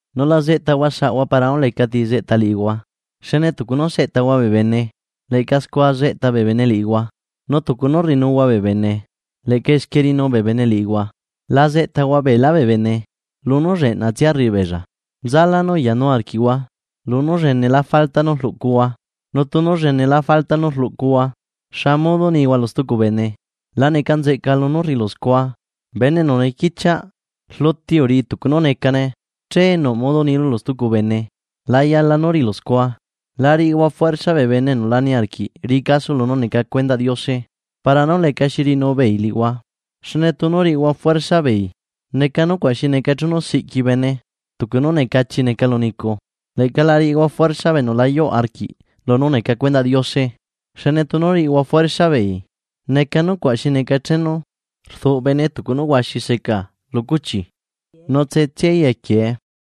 ’Nu la zeꞌtahua saꞌhua para nú lecati zeꞌta liꞌihua. Xne tucu nú seꞌtahua bee bene, leꞌca scua zeꞌta bee bene liꞌihua, nu tucu nú rriꞌinuhua bee bene leꞌca esquie riꞌinu bee bene liꞌihua. ¿La zeꞌtahua beelá bee bene lunú lleꞌnatsia rriꞌi beella, nzalá nú uyanu arquiꞌhua lunú llenelá falta nú rluꞌcuhua? Nu tunu llenelá falta nú rluꞌcuhua, ¿xa modo nihua lu stucu bene: “La neca nzeꞌca lunú rriꞌilu scua”? ¡Bene enu nequichiaꞌ! Rluti uriꞌi tucu nú necane, che nuꞌ modo nilu lu stucu bene la yala nú riꞌilu scua. ’La riꞌihua juersa bee bene enu la niarquiꞌ riꞌi caso lunú neca cuendaꞌ Diose, para nú lecaxi riꞌinu beei liꞌihua. Xne tunu riꞌihua juersa beei, neca nucuaꞌ xi neca chenu siꞌqui bene tucu nú necachi neca lu nicu. Leꞌca la riꞌihua juersa bee enu la yuꞌ arquiꞌ lunú neca cuendaꞌ Diose. Xne tunu riꞌihua juersa beei, neca nucuaꞌ xi neca chenu rduꞌ bene tucu nú huaxi seca lu cuchi nu tse tsiaí equiee.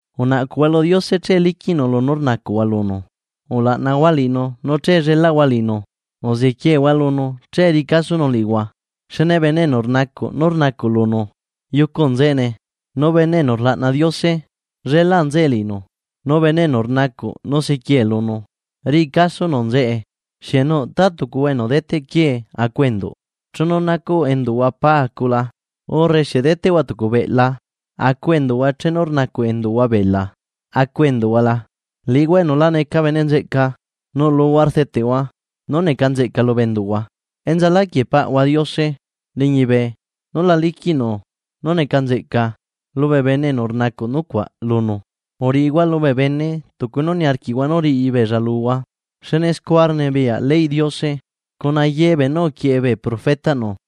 ’Unaꞌcuhua lu Diose che liquiꞌnu lunu rnacuꞌhua lunu, ulaꞌnahua liꞌinu nu che llelaꞌhua liꞌinu, uzequiehua lunu che riꞌi casonu liꞌihua. Xne bene enu rnacuꞌ nú rnacuꞌ lunu yucu nzeꞌene, nu bene enu rlaꞌna Diose llelaꞌ nzeꞌe liꞌinu, nu bene enu rnacuꞌ nu sequie lunu, riꞌi casonu nzeꞌe. ’¿Xieꞌ nuꞌ ta tucuhua enu deteꞌ quiee acu enduꞌ chenu nacuꞌ enduꞌhua pa acu la? ¿Urre xieꞌ deteꞌhua tucu beꞌla acu enduꞌhua chenu rnacuꞌ enduꞌhua bela acu enduꞌhua la? Liꞌihua enu la neca bene nzeꞌca, nuꞌluhua rdeteꞌhua nú neca nzeꞌca lubee enduꞌhua, ¡enzaláquieꞌ Paꞌahua Diose liñibe nú la liquiꞌnu nú neca nzeꞌca lubee bene enu rnacuꞌ nucuaꞌ lunu! ’Uriꞌihua lubee bene tucu nú niarquiꞌhua nú riꞌibeella luhua. Xne scua rnibiyaꞌ leyꞌ Diose cuna ye beenú uquieꞌe bee profetaꞌnu.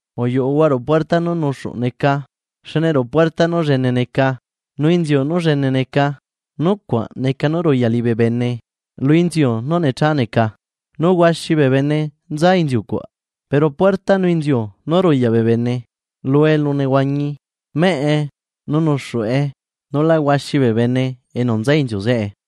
’Uyuꞌuhua ruꞌu puerta nú nuxuꞌ neca. Xne ruꞌu puerta nú llene neca, nu inziu nú llene neca, nucuaꞌ neca nú ruyaꞌ liꞌibee bene lu inziu nú necha neca, nu huaxi bee bene nza inziu cuaꞌ. Pero puerta nu inziu nú ruyaꞌ bee bene lu elunehuañi meꞌe nu nuxuꞌe, nu la huaxi bee bene enu nza inziu zeꞌe.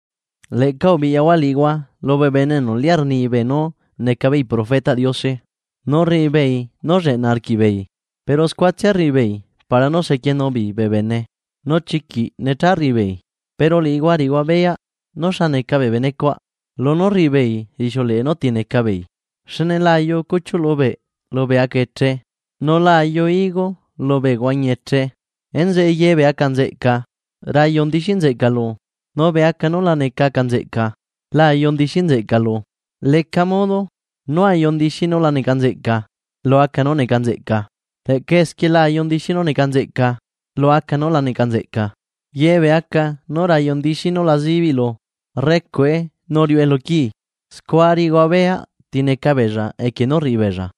’Leꞌca ubiꞌyahua liꞌihua lubee bene enu liꞌá rnibee nú neca beei profetaꞌ Diose, nu rriꞌi beei nú lleꞌna arquiꞌbeei, pero scuatsia rriꞌibeei para nú sequienu beei bee bene, nu chiquiꞌ necha rriꞌi beei. Pero liꞌihua riꞌihua beyaꞌ nú xa neca bee bene cuaꞌ, lunú rriꞌi beei rixiuleꞌe núti neca beei, xne la ayu cuchiuꞌ lubeꞌ lubee aca eche, nu la ayu higo lubee huañi eche. Enzeꞌe ye bee aca nzeꞌca rayu ndixi nzeꞌca lu. Nu bee aca nu la neca aca nzeꞌca la ayu ndixi nzeꞌca lu. Leca modo nú ayu ndixi núla neca nzeꞌca lu aca nú neca nzeꞌca, leꞌca esquie la ayu ndixi nú neca nzeꞌca lu aca núla neca nzeꞌca. Ye bee aca nú rayu ndixi nu la zibiꞌ lu, rrecuꞌe nu riuꞌe lu quii. Scua riꞌihua beyaꞌ ti neca beella equie nú rriꞌi beella.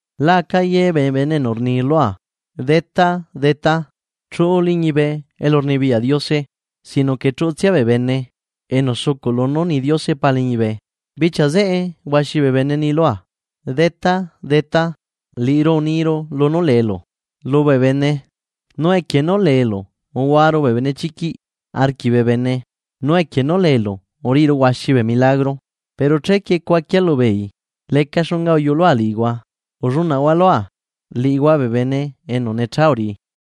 ’Laca ye bee bene enu rni lua: “Detá, Detá”, chuꞌu liñibe elurnibiyaꞌ Diose, sino que chuꞌutsia bee bene enu sucuꞌ lunú rni Diose Pa liñibe. Bichia zeꞌe huaxi bee bene ni lua: “Detá, Detá, liꞌiru uniru lunú leelu lubee bene, nu equie nú leelu uluaru bee benechiquiꞌ arquiꞌ bee bene nu equie nú leelu uriꞌiru huaxi bee milagro.” Pero chequie cuaquia lubeei: “Leca xunga uyulua liꞌihua, ullunaꞌhua lua, liꞌihua bee bene enu necha uriꞌi.”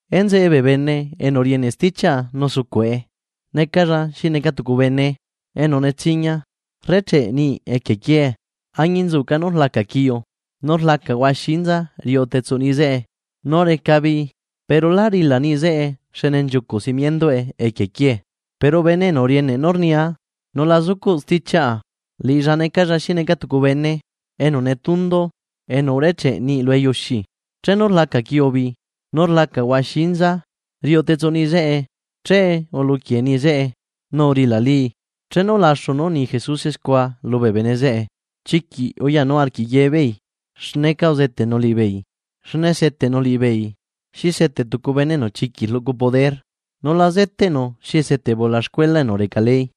’Enzeꞌe, bee bene enu rieneꞌ stichiaꞌa nu sucuꞌe, necalla xi neca tucu bene enu netsiña rrecheꞌ niꞌi equie quiee. Añinzuca nú rlaca quiu nu rlaca huaxi inza riuꞌu tetsuꞌ niꞌi zeꞌe nu reca bii, pero lá rila niꞌi zeꞌe xne nchiucuꞌ simienduꞌe equie quiee. Pero bene enu rieneꞌ nú rnia nu la zucuꞌ stichiaꞌa, liꞌilla necalla xi neca tucu bene enu netundu enu urecheꞌ niꞌi lu eyuxi. Chenu rlaca quiubi, nu rlaca huaxi inza riuꞌu tetsuꞌ niꞌi zeꞌe, che uluquie niꞌi zeꞌe. ¡Nu urilalii! Chenu ulaxu nú uni Jesuse scua lubee bene zeꞌe, chiquiꞌ uyanu arquiꞌ ye beei xneca uzeteꞌnu liꞌibeei, xne seteꞌnu beei xi seteꞌ tucu bene enu chiquiꞌ rluꞌcu poder, nu la zeteꞌnu xi seteꞌ bee ulaxcuela enu reca ley.